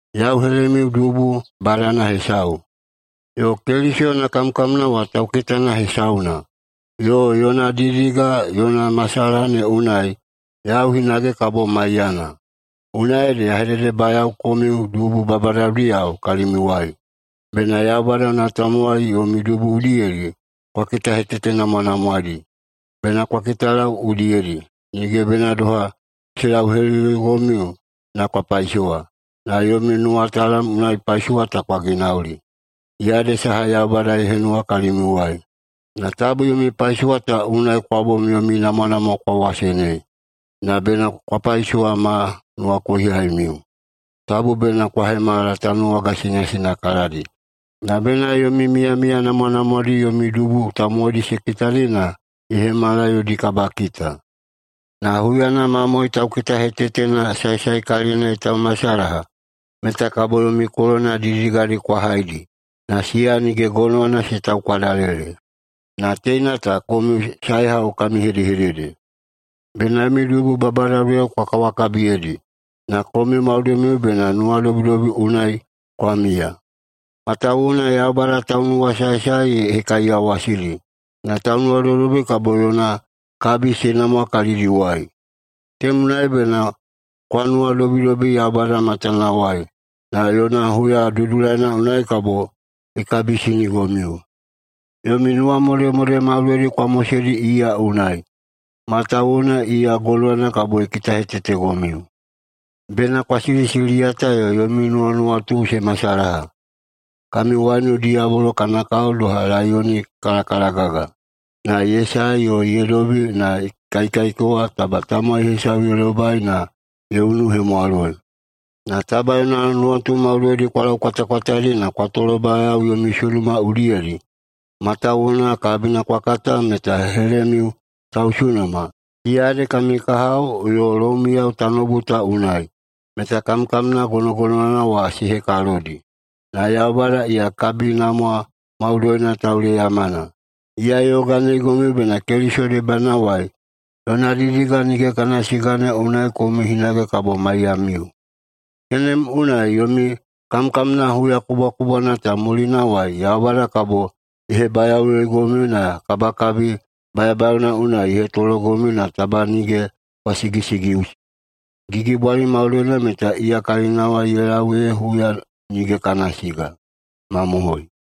Yau helemiu dubu badana hesau, yo Keliso yona kamkamna wa taukitana hesauna, yo yona didiga yona masalaha ne unai yau hinage kabo maiyana. Unai ede ya hededebayao komiu dubu babadadiyao kalimiuwai: Bena Yaubada yona tamowai yomi dubu udiyedi kwa kitahetetenamwanamwaeidi. Bena kwa kitalau udiyedi, nige bena doha se lauheliligomiu na kwa paisowa, na yomi nuwatalam unai paisowa ta kwa ginauli. Iya ede saha Yaubada ye henuwa kalimiuwai. Na tabu yomi paisowa ta unai kwa bom yomi namwanamwa kwa wasenei, na bena kwa paisowa ma nuwakohihaimiu. Tabu bena kwa hemala tanuwaga sinasinakaladi, na bena yomi miyamiya namwanamwadi yomi dubu tamowaidi se kitadi na ye hemala yodi kabakita. Na huyana mamoe taukitahetetena saesaekalilina ye taumasalaha, meta kabo yomi kolona didididigadi kwa haidi, na siya nige gonowana se taukwadalele. Na teina ta komiu saehau kami hedehedede: Bena yomi dubu babadadiyao kwa kawakabiyeidi. Na komiu maudoimiu bena nuwadobidobi unai kwa miya. Matawuwuna “Yaubada taunuwasaesae ye hekaiyawasidi, na taunuwadobidobi kabo yona kabi se namwa kalidiwai.” Tenem unai bena kwa nuwadobidobi Yaubada matanawai, na yona huya dudulaina unai kabo ye kabisinigomiu. Yomi nuwamodemode maudoidi kwa moseidi iya unai, matawuwuna iya gonowana kabo ye kitahetetegomiu. Bena kwa silisiliyata yo yomi nuwanuwatu se masalaha. Kami waiunu diyabolo kana kao doha laiyoni ye kalakalagaga, na ye sae yo ye dobi na ye kaikaikewa taba tamowai hesau ye lobai na ye unuhemwaloi. Na taba yona nuwatu maudoidi kwa laukwatakwataeidi na kwa tolobayao yomi sunuma udiyedi, matawuwuna kabina kwa kata meta helemiu tausunuma, siya ede kami kahao yo loumiyao tanoubu ta unai, meta kamkamna gonogonowana wa se hekalodi. Na Yaubada iya kabinamwa maudoina tauleyamana, iya ye yoganeigomiu bena Keliso debanawai yona didiga nige kana siga ne unai komiu hinage kabo maiyamiu. Tenem unai yomi kamkamna huya kubwakubwana ta mulinawai Yaubada kabo ye hebayaoꞌuyoigomiu na kabakabi bayabayaona unai ye hetologomiu na taba nige kwa sigisigiꞌusi. Gigibwali maudoina meta iya kalinawai ye lau ee huya nige kana siga. Mamohoi!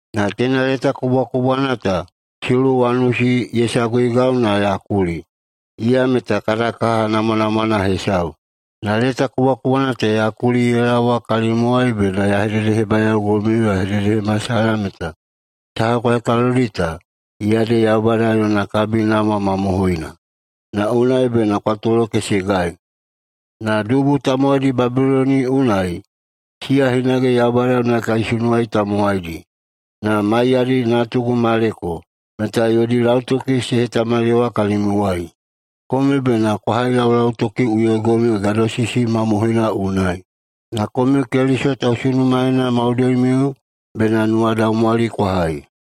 Na teina leta kubwakubwana ta Siluwanusi ye saguigau na ya kuli. Iya meta kada kaha namwanamwana hesau. Na leta kubwakubwana ta ya kuli ye laowa kalimiuwai bena ya hededehebayaogomiu yo ya hededehemasalaha meta saha kwa hekalodi ta, iya ede Yaubada yona kabinamwa mamohoina. Na unai bena kwa tolokesegai. Na dubu tamowaidi Babiloni unai, siya hinage Yaubada yona kaisunuwa tamowaidi, na maiyadi natugu Maleko, meta yodi lautoki se hetamaliyawa kalimiuwai. Komiu bena kwa hailaulautokiꞌuyoigomiu gadosisi mamohoina unai. Na komiu Keliso tausunumaena maudoimiu bena nuwadaumwali kwa hai.